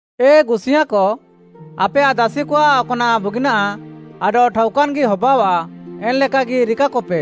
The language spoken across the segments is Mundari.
ଏ ଗୁସିୟାଁକ, ଆପେୟାଃ ଦାସିକଆଃ ଅକ୍‌ନାଃ ବୁଗିନାଃ ଆଡଃ ଠାଉକାନ୍‌ଗି ହବାଅଃଆ ଏନ୍‌ଲେକାଗି ରିକାକପେ।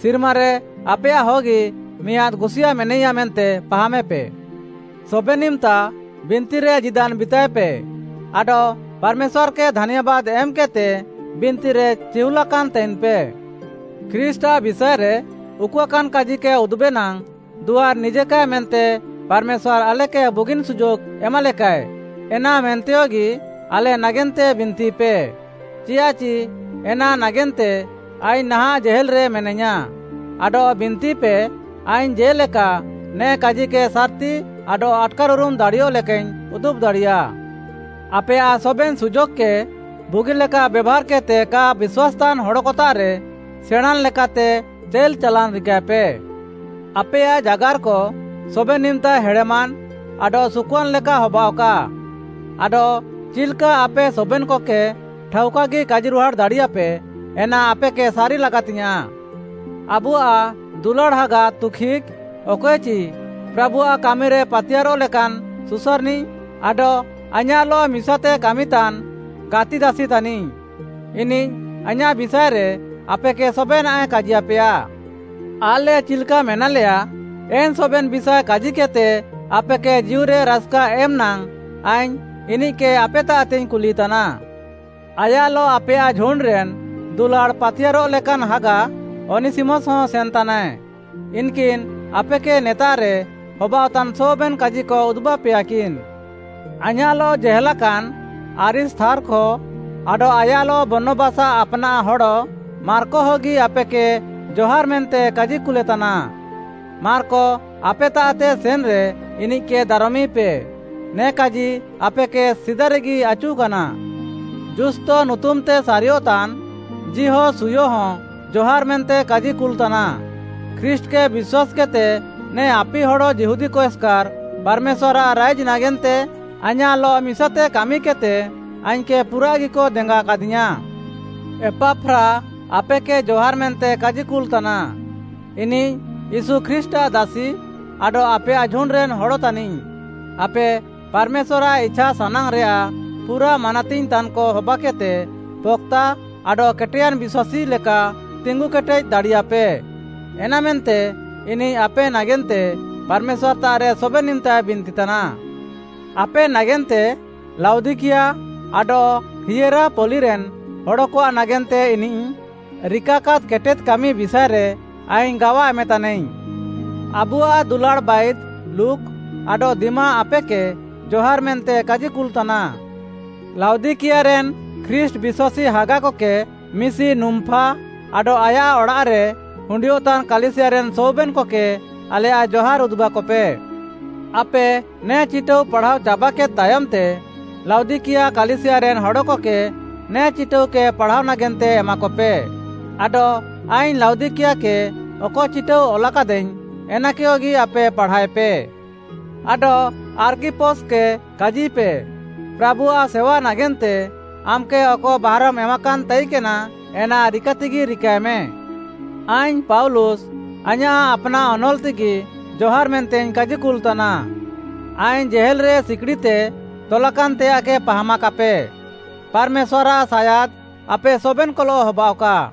ସିର୍ମାରେ ଆପେୟାଃହଗି ମିଆଁଦ୍‌ ଗୁସିୟାଁ ମେନାଇୟା ମେନ୍ତେ ପାହାମେପେ। ସବେନ୍‌ ଇମ୍‌ତା ବିନ୍ତିରେ ଜୀଦାନ୍‌ ବିତାଏପେ ଆଡଃ ପାର୍‌ମେଶ୍ୱାର୍‌କେ ଧାନ୍ୟାବାଦ୍‌ ଏମ୍‌କେଦ୍‌ତେ ବିନ୍ତିରେ ଚିହୁଲାକାନ୍‌ ତାଇନ୍‌ପେ। ଖ୍ରୀଷ୍ଟ୍‌ଆଃ ବିଷାଏରେ ଉକୁଆକାନ୍‌ କାଜିକେ ଉଦୁବେ ନାଙ୍ଗ୍‌ ଦୁଆର୍‌ ନିଜେକାଏ ମେନ୍ତେ ପାର୍‌ମେଶ୍ୱାର୍‌ ଆଲେକେ ବୁଗିନ୍‌ ସୁଯୋଗ୍‌ ଏମାଲେକାଏ, ଏନାମେନ୍ତେୟଗି ଆଲେ ନାଗେନ୍ତେ ବିନ୍ତିପେ। ଚିଆଃଚି ଏନା ନାଗେନ୍ତେ ଆଇଙ୍ଗ୍‌ ନାହାଁଃ ଜେହେଲ୍‌ରେ ମେନାଇୟାଁ, ଆଡଃ ବିନ୍ତିପେ, ଆଇଙ୍ଗ୍‌ ଜେ'ଲେକା ନେ କାଜିକେ ସାର୍‌ତି ଆଡଃ ଆଟ୍‌କାର୍‌ଉରୁମ୍‌ ଦାଡ଼ିୟଃ ଲେକାଇଙ୍ଗ୍‌ ଉଦୁବ୍‌ ଦାଡ଼ିୟା। ଆପେୟାଃ ସବେନ୍‌ ସୁଯୋଗ୍‌କେ ବୁଗିଲେକା ବେଭାର୍‌କେଦ୍‌ତେ କା ବିଶ୍ୱାସ୍‌ତାନ୍‌ ହଡ଼କତାଃରେ ସେଣାଁନ୍‌ ଲେକାତେ ଚାଇଲ୍‌ ଚାଲାନ୍‌ ରିକାଏପେ। ଆପେୟାଃ ଜାଗାର୍‌କ ସବେନ୍‌ ଇମ୍‌ତା ହେଡ଼େମାନ୍‌ ଆଡଃ ସୁକୁଆନ୍‌ ଲେକା ହବାଅଃକା। ଆଡଃ ଚିଲ୍‌କା ଆପେ ସବେନ୍‌କକେ ଠାଉକାଗି କାଜିରୁହାଡ଼୍‌ ଦାଡ଼ିୟାପେ, ଏନା ଆପେକେ ସାରି ଲାଗାତିୟାଁ। ଆବୁଆଃ ଦୁଲାଡ଼୍‌ ହାଗା ତୁଖିକ୍‌, ଅକଏଚି ପ୍ରାଭୁଆଃ କାମିରେ ପାତିୟାର୍‌ରଃ ଲେକାନ୍‌ ସୁସାର୍‌ନିଃ ଆଡଃ ଆଇଁୟାଃଲଃ ମିସାତେ କାମିତାନ୍‌ ଗାତିଦାସି ତାନିଃ। ଇନିଃ ଆଇଁୟାଃ ବିଷାଏରେ ଆପେକେ ସବେନାଃଏ କାଜିୟାପେଆ। ଆଲେ ଚିଲ୍‌କା ମେନାଲେୟା, ଏନ୍‌ ସବେନ୍‌ ବିଷାଏ କାଜିକେଦ୍‌ତେ ଆପେକେ ଜୀଉରେ ରାସ୍‌କା ଏମ୍‌ ନାଙ୍ଗ୍‌ ଆଇଙ୍ଗ୍‌ ଇନିଃକେ ଆପେତାଃତେଇଙ୍ଗ୍‌ କୁଲିତାନା। ଆୟାଃଲଃ ଆପେୟାଃ ଝୁଣ୍ଡ୍‌ରେନ୍‌ ଦୁଲାଡ଼୍‌ ପାତିୟାର୍‌ରଃ ଲେକାନ୍‌ ହାଗା ଅନିସିମସ୍‌ହଁ ସେନ୍‌ତାନାଏ। ଇନ୍‌କିନ୍‌ ଆପେକେ ନେତାଃରେ ହବାଅଃତାନ୍‌ ସବେନ୍‌ କାଜିକ ଉଦୁବାପେୟାକିନ୍‌। ଆଇଁୟାଃଲଃ ଜେହେଲାକାନ୍ ଆରିସ୍ତାର୍ଖ ଆଡଃ ଆୟାଃଲଃ ବର୍ଣ୍ଣବାସ୍‌ଆଃ ଆପ୍‌ନାଃ ହଡ଼ ମାର୍କହଗି ଆପେକେ ଜହାର୍‌ ମେନ୍ତେ କାଜିକୁଲେ ତାନା। ମାର୍କ ଆପେତାଃତେ ସେନ୍‌ରେ ଇନିଃକେ ଦାରମିପେ। ନେ କାଜି ଆପେକେ ସିଦାରେଗି ଆଚୁକାନା। ଯୁସ୍ତ ନୁତୁମ୍‌ତେ ସାରିୟଃତାନ୍ ଯିହୋଶୁୟହଁ ଜହାର୍‌ ମେନ୍ତେ କାଜିକୁଲ୍‌ ତାନା। ଖ୍ରୀଷ୍ଟ୍‌କେ ବିଶ୍ୱାସ୍‌କେଦ୍‌ତେ ନେ ଆପିହଡ଼୍‌ ଯିହୁଦୀକ ଏସ୍‌କାର୍‌ ପାର୍‌ମେଶ୍ୱାର୍‌ଆଃ ରାଇଜ୍‌ ନାଗେନ୍ତେ ଆଇଁୟାଃଲଃ ମିସାତେ କାମିକେଦ୍‌ତେ ଆଇଙ୍ଗ୍‌କେ ପୁରାଃଗିକ ଦେଙ୍ଗାକାଦିୟାଁ। ଏପାଫ୍ରା ଆପେକେ ଜହାର୍‌ ମେନ୍ତେ କାଜିକୁଲ୍‌ ତାନା। ଇନିଃ ୟୀଶୁ ଖ୍ରୀଷ୍ଟ୍‌ଆଃ ଦାସି ଆଡଃ ଆପେୟାଃ ଝୁଣ୍ଡ୍‌ରେନ୍‌ ହଡ଼ ତାନିଃ। ଆପେ ପାର୍‌ମେଶ୍ୱାର୍‌ଆଃ ଇଛାସାନାଙ୍ଗ୍‌ରେୟାଃ ପୁରା ମାନାତିଙ୍ଗ୍‌ ତାନ୍‌କ ହବାକେଦ୍‌ତେ ପକ୍‌ତା ଆଡଃ କେଟେୟାନ୍‌ ବିଶ୍ୱାସୀ ଲେକା ତିଙ୍ଗୁକେଟେଦ୍‌ ଦାଡ଼ିୟାପେ, ଏନାମେନ୍ତେ ଇନିଃ ଆପେ ନାଗେନ୍ତେ ପାର୍‌ମେଶ୍ୱାର୍‌ତାଃରେ ସବେନ୍‌ ଇମ୍‌ତାଏ ବିନ୍ତିତାନା। ଆପେ ନାଗେନ୍ତେ, ଲାଉଦିକିଆ ଆଡଃ ହିଏରାପଲିରେନ୍‌ ହଡ଼କଆଃ ନାଗେନ୍ତେ ଇନିଃ ରିକାକାଦ୍‌ କେଟେଦ୍‌ କାମି ବିଷାଏରେ ଆଇଙ୍ଗ୍‌ ଗାୱା ଏମେତାନାଇଙ୍ଗ୍‌। ଆବୁଆଃ ଦୁଲାଡ଼୍‌ ବାଇଦ୍‌ ଲୁକ୍‌ ଆଡଃ ଦିମା ଆପେକେ ଜହାର୍‌ ମେନ୍ତେ କାଜିକୁଲ୍‌ ତାନା। ଲାଉଦିକିଆରେନ୍‌ ଖ୍ରୀଷ୍ଟ୍‌ ବିଶ୍ୱାସୀ ହାଗାକକେ, ମିଶି ନୁମ୍‌ଫା ଆଡଃ ଆୟାଃ ଅଡ଼ାଃରେ ହୁଣ୍ଡିୟଃତାନ୍‌ କାଲିସିୟାରେନ୍‌ ସବେନ୍‌କକେ ଆଲେୟାଃ ଜହାର୍‌ ଉଦୁବାକପେ। ଆପେ ନେ ଚିଟାଉ ପାଢ଼ାଅ ଚାବାକେଦ୍‌ ତାୟମ୍‌ତେ, ଲାଉଦିକିଆ କାଲିସିୟାରେନ୍‌ ହଡ଼କକେ ନେ ଚିଟାଉକେ ପାଢ଼ାଅ ନାଗେନ୍ତେ ଏମାକପେ। ଆଡଃ ଆଇଙ୍ଗ୍‌ ଲାଉଦିକିଆକେ ଅକ ଚିଟାଉ ଅଲାକାଦାଇଙ୍ଗ୍‌, ଏନାକେୟଗି ଆପେ ପାଢ଼ାଏପେ। ଆଡଃ ଆର୍ଖିପସ୍‌କେ କାଜିପେ, “ପ୍ରାଭୁଆଃ ସେୱା ନାଗେନ୍ତେ ଆମ୍‌କେ ଅକ ବାହାରମ୍‌ ଏମାକାନ୍‌ ତାଇକେନା, ଏନା ରିକାତେଗି ରିକାଏମେ।” ଆଇଙ୍ଗ୍‌ ପାଉଲୁସ୍‌ ଆଇଁୟାଃ ଆପ୍‌ନାଃ ଅନଲ୍‌ତେଗି ଜହାର୍‌ ମେନ୍ତେଇଙ୍ଗ୍‌ କାଜିକୁଲ୍‌ ତାନା। ଆଇଙ୍ଗ୍‌ ଜେହେଲ୍‌ରେ ସିକିଡ଼ିତେ ତଲାକାନ୍‌ତେୟାଃକେ ପାହାମାକାପେ। ପାର୍‌ମେଶ୍ୱାର୍‌ଆଃ ସାୟାଦ୍‌ ଆପେ ସବେନ୍‌କଲଃ ହବାଅଃକା।